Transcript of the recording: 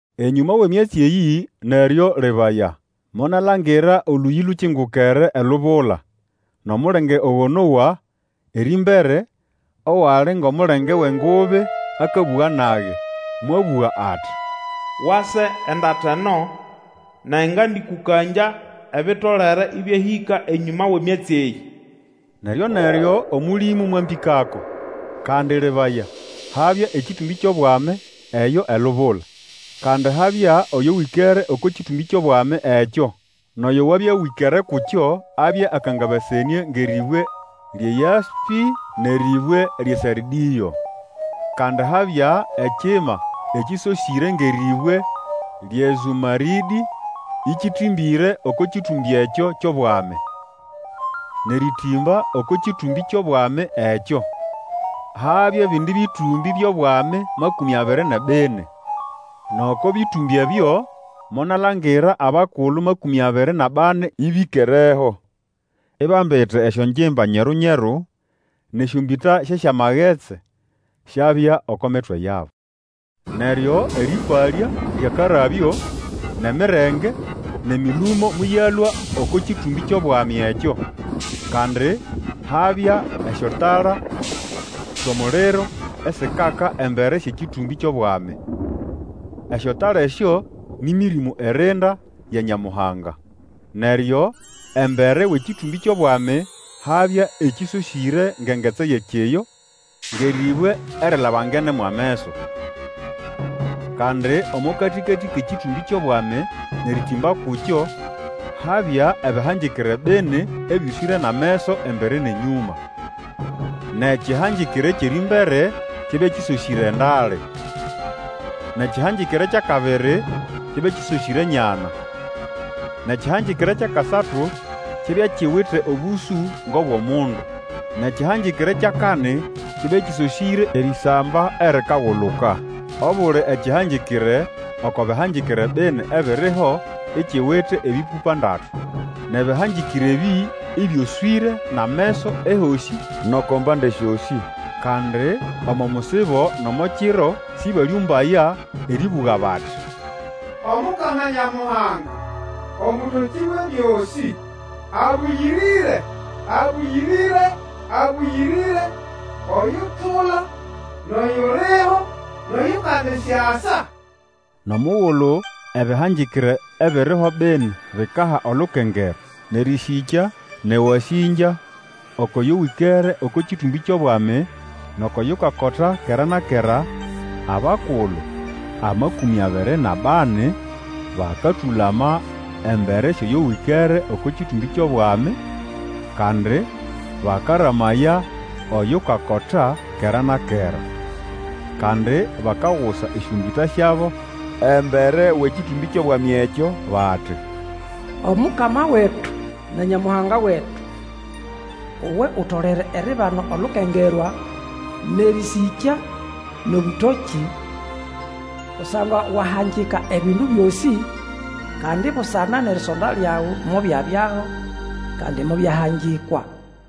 Enyũma wʼemyatsi eyĩ, neryo lebaya, monalangira Olũyĩ lukingukere elubula. Nʼomulenge ogo nowa erĩmbere, owali ngʼomulenge wʼengubi akabũga nage, mwabũga ati, Wase endata eno, nage ngandĩkũkangya ebitolere ĩbyahĩka enyũma wʼemyatsi eyĩ. Neryo-neryo Omũlĩmũ mwambĩkako. Kandi lebaya, habya ekĩtũmbĩ kyʼobwami eyo elubula, kandi habya Oyo wĩkere oko kĩtũmbĩ kyʼobwami ekyo. Nʼoyo wabya wĩkere kukyo abya akangabasenĩe ngʼerĩbwe lyʼeYaspĩ nʼerĩbwe lyʼeSardĩo. Kandi habya ekima ekĩsosĩre ngʼerĩbwe lyʼeZũmarĩdĩ ĩkĩtĩmbĩre oko kĩtũmbĩ ekyo kyʼobwami. Nʼerĩtĩmba oko kĩtũmbĩ kyʼobwami ekyo, habya ebindi bĩtũmbĩ byʼobwami amakũmĩ abiri nʼebini. Nʼoko bĩtũmbĩ ebyo monalangira abakulu makũmĩ abiri nʼabani ĩbĩkereho, ibambite esyongimba nyeru-nyeru, nʼesyombĩta syʼesyamagetsi syabya oko mitwe yabo. Neryo erĩpalya lyʼakarabyo, nʼemirenge, nʼemĩlũmo mobyalũa oko kĩtũmbĩ kyʼobwami ekyo. Kandi habya esyotala syʼomuliro esikaka embere syʼekĩtũmbĩ kyʼobwami. Esyotala esyo nĩ Mĩrĩmũ irinda ya Nyamuhanga. Neryo embere wʼekĩtũmbĩ kyʼobwami habya ekĩsosĩre ngʼengetsi eyʼekiyo ngʼerĩbwe erilabangene mwʼameso. Kandi omo katĩkatĩ kʼekĩtũmbĩ kyʼobwami nʼerĩtĩmba kukyo habya ebĩhangĩkĩre bini ebyoswĩre nʼameso embere nʼenyũma. Nʼekĩhangĩkĩre ekyʼerĩmbere kyabya kĩsosĩre endale, nʼekĩhangĩkĩre kyʼakabiri kyabya kĩsosĩre enyana, nʼekĩhangĩkĩre kyʼakasatu kyabya kiwite obũsũ ngʼobwʼomundu, nʼekĩhangĩkĩre kyʼakani kyabya kĩsosĩre erĩsamba erikaguluka. Obuli ekĩhangĩkĩre oko bĩhangĩkĩre bini ebiriho ikiwite ebĩpũpa ndatu, nʼebĩhangĩkĩre ebĩ ĩbyoswĩre nʼameso ehosĩ nʼoko mbande syosĩ. Kandi omo musibo nʼomo kiro sĩbalĩũmbaya erĩbũga bati, Omukama Nyamuhanga, Omũtokĩ Wʼebyosĩ, Abũyĩrĩre, abũyĩrĩre, abũyĩrĩre, Oyutula, nʼoyuliho, nʼoyukandisyasa. Nʼomugulu ebĩhangĩkĩre ebiriho bini bikaha olukengerwa, nʼerĩsĩkya, nʼewasĩngya oko yo wĩkere oko kĩtũmbĩ kyʼobwami, nʼoko yukakota kera na kera, abakulu amakũmĩ abiri nʼabani bakatũlama embere syʼoyo wĩkere oko kĩtũmbĩ kyʼobwami, kandi bakaramaya oyukakota kera na kera. Kandi bakagusa esyombĩta syabo embere wʼekĩtũmbĩ kyʼobwami ekyo, bati, Omukama wetu na Nyamuhanga wetu! Uwe utolere eribana olukengerwa, nʼerĩsĩkya, nʼobũtokĩ, Kusangwa wahangika ebindu byosĩ, Kandi busana nʼerisonda lyawe mobyabyaho kandi mobyahangikwa.